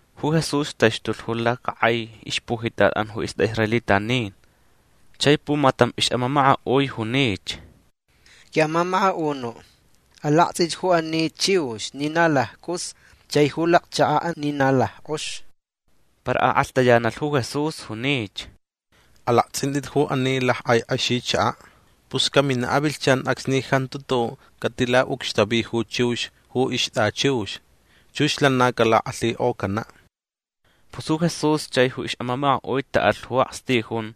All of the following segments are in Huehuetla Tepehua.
Ju Jesús taxtulh ju lacakʼai ixpujitatʼan ju istʼaʼisraelitanin. Chai pumatam ixʼamamakaʼui junich: ―Quiʼamamakaʼunuʼ alaktsʼich ju ani chiux ni na laccʼus chai ju lacchakaʼ ni na lackʼox. Para akʼalhtayanalh ju Jesús. Junich: ―Alaktsʼintʼit ju ani lackʼai kʼexichakaʼ. Pus caminaʼ avilhchan acsni jantu tuʼuʼ catilaʼucxtavi ju chiux ju ixtʼachiux. Chux lana calakʼalhikʼocanaʼ. Pus ju Jesús chai ju ixʼamamakaʼui taʼalh ju akstijun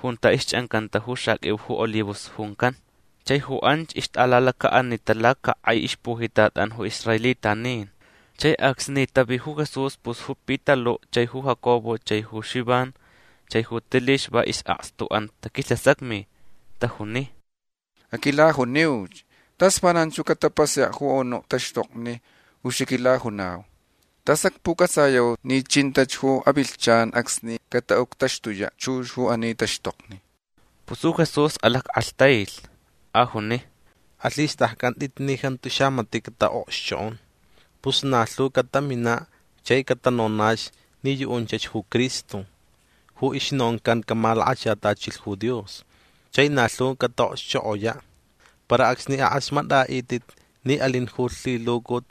junta ixchʼancanta ju xaqʼuiu ju olivos juncan. Chai ju anch ixtʼalalacaʼanita lacakʼai ixpujitatʼan ju israelitanin. Chai acsni tavi ju Jesús pus ju Pitaluʼ chai ju Jacobo chai ju Xivan chai ju Tilix va isʼakstuʼan taquilhasacmi. Tajuni: ―Aquilajuniuch. Tas vananch ju catapasayaʼ ju anuʼ taxtokni ju xaquilajunau. Tas acpucʼatsayau ni chinta ju avilhchan acsni cataʼuctaxtuyaʼ chux ju ani taxtokni. Pus ju Jesús alackʼalhtailh. Ajuni: ―Alhistʼaccʼantʼit ni jantu xamatiʼ cataʼokxchokʼon. Pus na lhu cataminaʼ chai catanonach ni yuʼunchach ju Cristo ju ixnoncan camalakachatachilh ju Dios. Chai na lhu cataʼokxchokʼoyaʼ. Para acsni akʼasmatʼaʼitʼit ni alin ju lhilucut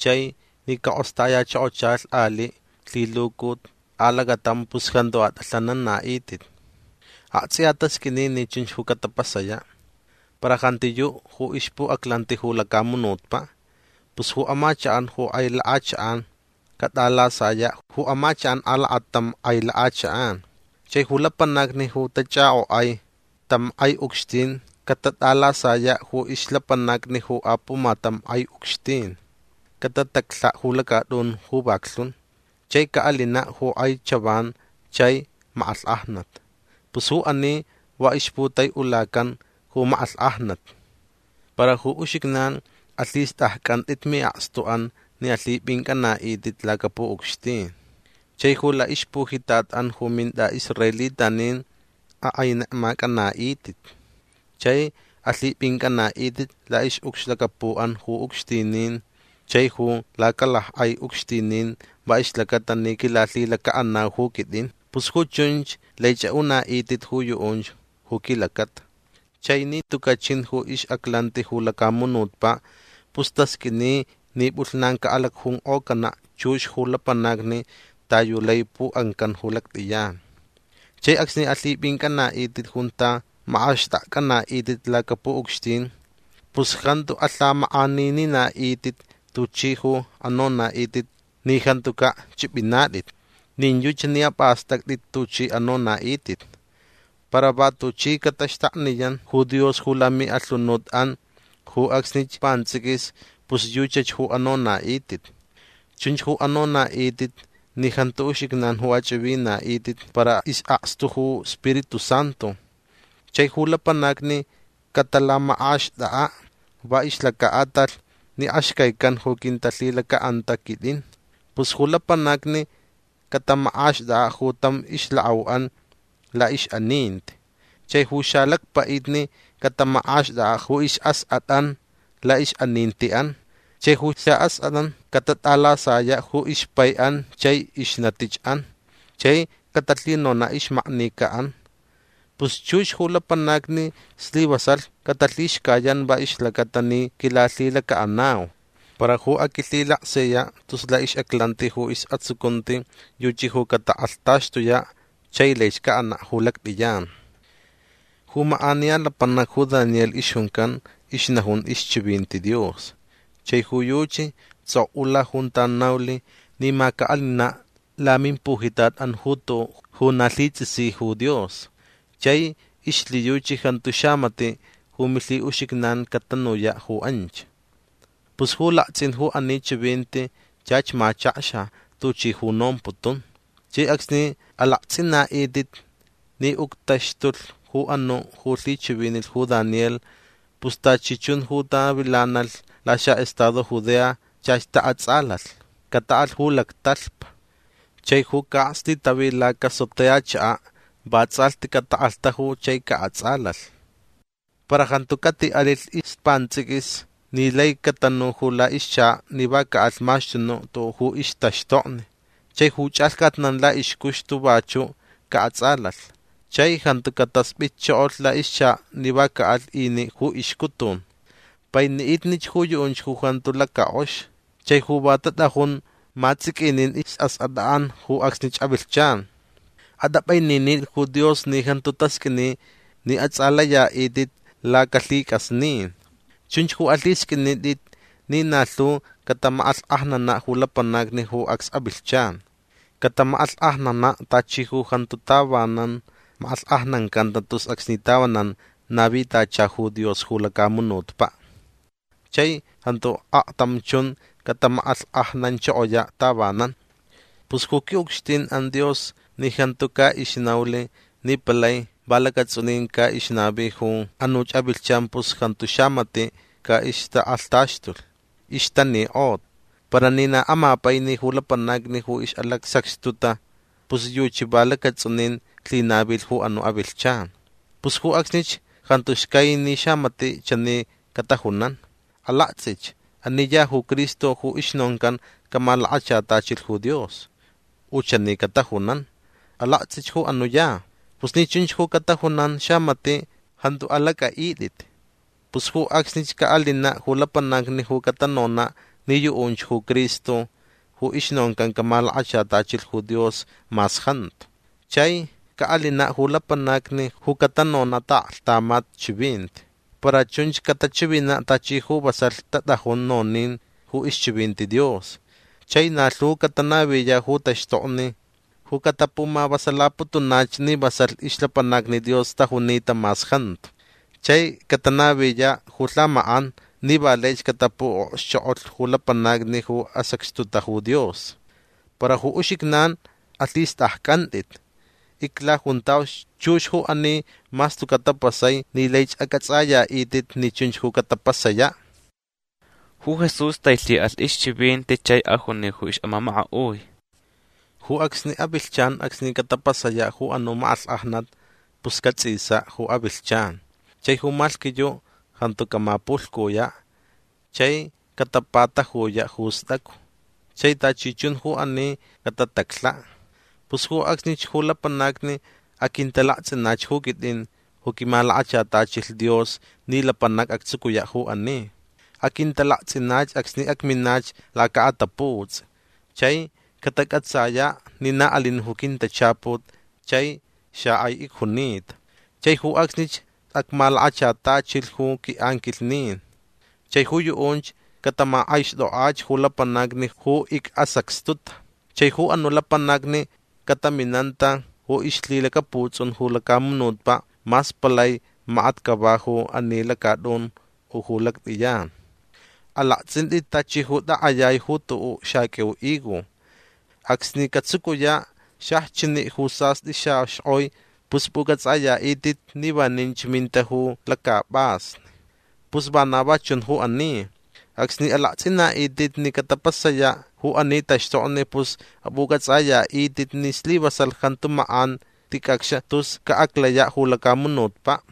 chai ni cakʼostayachokochalh aliʼ lhilucut alacatam pus jantu atʼalhananaʼitʼit. Aktsʼiya tasqʼuini ni chunch ju catapasayaʼ. Para jantiyuʼ ju ixpuʼaclanti ju lacamunutpaʼ. Pus ju amachakʼan ju kʼai lakʼachakʼan catʼalasayaʼ ju amachakʼan alakatam kʼai lakʼachakʼan. Chai ju lapanacni ju tachʼakʼokʼai tam kʼai ucxtin catatʼalasayaʼ ju ixlapanacni ju apumatam kʼai ucxtin. Catataclhaʼ ju lacatʼun ju vaklhun. Chai caʼalinaʼ ju kʼai chavan chai makʼalhkʼajnat. Pus ju ani va ixputaiʼulacan ju makʼalhkʼajnat. Para ju uxijnan alhistʼaccʼantʼit miʼakstuʼan ni alhipʼincʼanaʼitʼit lacapuʼucxtin. Chai ju laʼixpujitatʼan ju mintʼaʼisraelitanin akʼainekmacʼanaʼitʼit. Chai alhipʼincʼanaʼitʼit laʼixʼucxlacapuʼan ju ucxtinin chai ju lacalackʼai ucxtinin va ixlacata ni quilalhilacaʼanau ju quitʼin. Pus ju chunch laich aʼunaʼitʼit ju yuʼunch ju quilacata. Chai ni tucaʼ chin ju ixʼaclanti ju lacamunutpaʼ pus tasqʼuini ni pʼulhnan caʼalacjunkʼocanaʼ chux ju lapanacni ta yu lai puʼancan ju lactʼiyan. Chai acsni alhipʼincʼanaʼitʼit junta makʼaxtʼakcʼanaʼitʼit lacapuʼucxtin pus jantu alhamakʼanininaʼitʼit tuchʼi ju anonaʼitʼit ni jantucaʼ chʼipʼinatʼit. Nin yuchi ni apʼastʼactʼit tuchʼi anonaʼitʼit. Para va tuchi cataxtakniyan ju Dios ju lamiʼalhunutʼan ju acsnich pantsʼiquis pus yuchach ju anonaʼitʼit. Chunch ju anonaʼitʼit ni jantu uxijnan ju achʼivinaʼitʼit para isʼakstu ju Spiritu Santu. Chai ju lapanacni catalamakʼaxtʼakʼaʼ va ixlacaʼatalh ni axcaican ju quintalhilacaʼanta quitʼin. Pus ju lapanacni catamakʼaxtʼakʼaʼ ju tam ixlakʼauʼan laʼixʼaninti. Chai ju xalacpaʼitni catamakʼaxtʼakʼaʼ ju isʼaskʼatʼan laʼixʼanintiʼan. Chai ju saʼaskʼatʼan catatʼalasayaʼ ju ixpaiʼan chai ixnatichʼan chai catalhinonaʼ ixmaknicaʼan. Pus chux ju lapanacni slivasalh catalhixcayan va ixlacata ni quilalhilacaʼanau. Para ju aquilhilaksiyaʼ tus laʼixʼaclanti ju isʼatsucunti yuchi ju catakʼalhtaxtuyaʼ chai laich caʼanaʼ ju lactʼiyan. Ju makʼaniya lapanac ju Daniel ixjuncan ixnajun ixchivinti Dios. Chai ju yuchi tsʼokʼula junta naulh ni ma caʼalinaʼ lamimpujitatʼan ju tuʼuʼ ju na lhitsʼisi ju Dios. Chai ixlhiyuchi jantu xamatiʼ ju milhiʼuxijnan catanuyaʼ ju anch. Pus ju laktsʼin ju ani chivinti chach machakxa tuchi ju nomputun. Chai acsni alaktsʼinaʼitʼit ni uctaxtulh ju anuʼ ju lhichivinilh ju Daniel pus tachi chun ju tavilanalh laxaʼestado Judea chach taʼatsʼalalh. Cataʼalh ju lactalhpa. Chai ju caʼakstitavi lacasotea chakaʼ va tsʼalhti catakʼalhtaju chai caʼatsʼalalh. Para jantu catiʼalilh ispantsʼiquis ni lai catanu ju laʼixchakaʼ ni va caʼalh maxtunuʼ tuʼuʼ ju ixtaxtokni. Chai ju chʼalhcatnan laʼixcuxtu vachuʼ caʼatsʼalalh. Chai jantu cataspʼitchokolh laʼixchakaʼ ni va caʼalh iniʼ ju ixcutun. Painiʼitnich ju yuʼunch ju jantu lacakʼox chai ju va tatʼajun matsʼiquinin isʼaskʼatʼan ju acsnich avilhchan. Atʼapʼaininitʼit ju Dios ni jantu tasqʼuini ni atsʼalayaʼitʼit lacalhicʼasnin. Chunch alhisqʼuinitʼit ni na lhu catamakʼalhkʼajnanaʼ ju lapanacni ju acs avilhchan. Catamakʼalhkʼajnanaʼ tachi ju jantu tavanan makʼalhkʼajnancanta tus acsni tavanan navicantacha ju Dios ju lacamunutpaʼ. Chai jantu aktam chun catamakʼalhkʼajnanchokoyaʼ tavanan. Pus ju quiʼucxtinʼan Dios ni jantu caʼixnaulh ni palai va lacatsʼunin caʼixnavi ju anuch avilhchan pus jantu xamatiʼ caʼixtakʼalhtaxtulh. Ixtanikʼota. Para ni na amapaini ju lapanacni ju ixʼalacsacxtuta pus yuchi va lacatsʼunin lhinavilh ju anuʼ avilhchan. Pus ju acsnich jantu xcai ni xamatiʼ chani catajunan: “Alaktsʼich. Ani ya ju Cristo ju ixnoncan camalakachatachilh ju Dios”. U chani catajunan: “Alaktsʼich anuʼ ya”. Pus ni chunch ju catajunan xamatiʼ jantu alacʼaʼitʼit. Pus ju acsnich caʼalinaʼ ju lapanacni ju catanonaʼ ni yuʼunch ju Cristo ju ixnoncan camalakachatachilh ju Dios mas jantu. Chai caʼalinaʼ ju lapanacni ju catanonaʼ ju taʼaklhtamat chivinti. Para chunch catachivinaʼ tachi ju vasalh tatʼajun nonin ju ixchivinti Dios. Chai na lhu catanaviyaʼ ju taxtokni ju catapumavasalaputunach ni vasalh ixlapanacni Dios tajunita mas jantu. Chai catanaviyaʼ ju lhamakʼan ni va laich catapuʼokxchokʼolh ju lapanacni ju asacxtuta ju Dios. Para ju uxijnan alhistʼaccʼantʼit. Iclajuntauch chux ju ani mas tucaʼ tapasai ni laich acʼatsʼayaʼitʼit ni chunch ju catapasayaʼ. Ju Jesús tailhiʼalh ixchivinti chai ajuni ju ixʼamamakaʼui: ―Ju acsni avilhchan acsni catapasayaʼ ju anuʼ makʼalhkʼajnat pus catsʼisaʼ ju avilhchan. Chai ju malhquiyuʼ jantu camapulhcuyaʼ. Chai catapatajuyaʼ ju stʼacu. Chai tachi chun ju ani catataclhaʼ. Pus ju acsnich ju lapanacni aquintalaktsʼinach ju quitʼin ju quimalakachatachilh Dios ni lapanac actsucuyaʼ ju ani. Aquintalaktsʼinach acsni acminach lacaʼataputsʼi. Chai catacʼatsayaʼ ni na alin ju quintachaput chai xakʼai icjunita. Chai ju acsnich acmalakachatachilh ju quiʼanquilhnin. Chai ju yuʼunch catamakʼaixtʼokʼach ju lapanacni ju icʼasacxtuta. Chai ju anuʼ lapanacni cataminanta ju ixlhilacaputsʼun ju lacamunutpaʼ mas palai makat cava ju ani lacatʼun u ju lactʼiyan. Alaktsʼintʼit tachi ju takʼayai ju tuʼuʼ xaqʼuiu higo. Acsni catsucuyaʼ xajchiniʼ ju sastʼi xaxkʼoi pus pʼucʼatsʼayatʼit ni vaninch minta ju lacapʼasni. Pus vana va chun ju ani. Acsni alaktsʼinaʼitʼit ni catapasayaʼ ju ani taxtokni pus apʼucʼatsʼayaʼitʼit ni slivasalh jantu makʼan ticʼacx tus caʼaclayaʼ ju lacamunutpaʼ.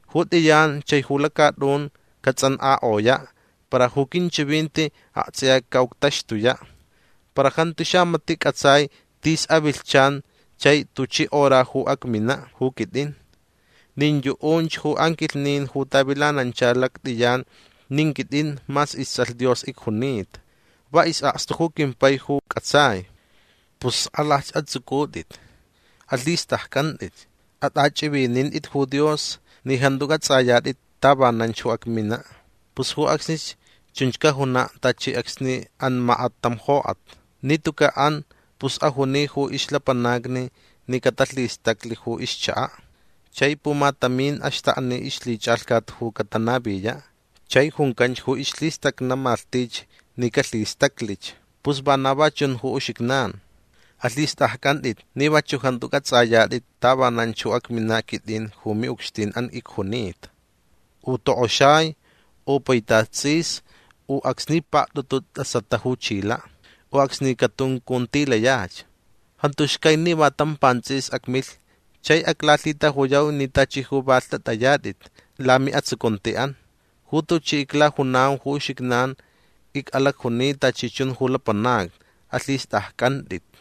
Ju tʼiyan chai ju lacatʼun catsʼankʼakʼoyaʼ. Para ju quinchivinti aktsʼiya caʼuctaxtuyaʼ. Para jantu xamatiʼ cʼatsai tis avilhchan chai tuchi hora ju acminaʼ ju quitʼin. Nin yuʼunch ju anquilhnin ju tavilanancha lactʼiyan nin quitʼin mas istsʼalh Dios icjunita. Va isʼakstu ju quimpai ju cʼatsai. Pus skʼalalhch atsʼucʼutʼit. Alhistʼaccʼantʼit. Atʼachʼivinintʼit ju Dios ni jantu cʼatsʼayatʼit tavananch ju acminaʼ. Pus ju acsnich chunch cajunaʼ tachi acsni an makat tam jokʼat. Ni tucaʼ an pus ajuni ju ixlapanacni ni catalhistaclh ju ixchakaʼ. Chai pumatamin axtakni ixlhichʼalhcat ju catanaviyaʼ. Chai juncanch ju ixlhistʼacʼa malhtich ni calhistaclich. Pus vana va chun ju uxijnan. Alhistʼaccʼantʼit ni vachuʼ jantu cʼatsʼayatʼit tavananch ju acminaʼ quitʼin ju miʼucxtinʼan icjunita. U tokʼoxai. U paitat tsʼis. U acsni paktʼutu tʼasata ju chilaʼ. U acsni catuncuntilayach. Jantu xcai ni va tam pantsʼiquis acmilh chai aclalhitajuyau ni tachi ju va lhtʼatʼayatʼit lamiʼatsucuntiʼan. Ju tuchi iclajunau ju uxijnan icʼalacjuni tachi chun ju lapanacni. Alhistʼaccʼantʼit.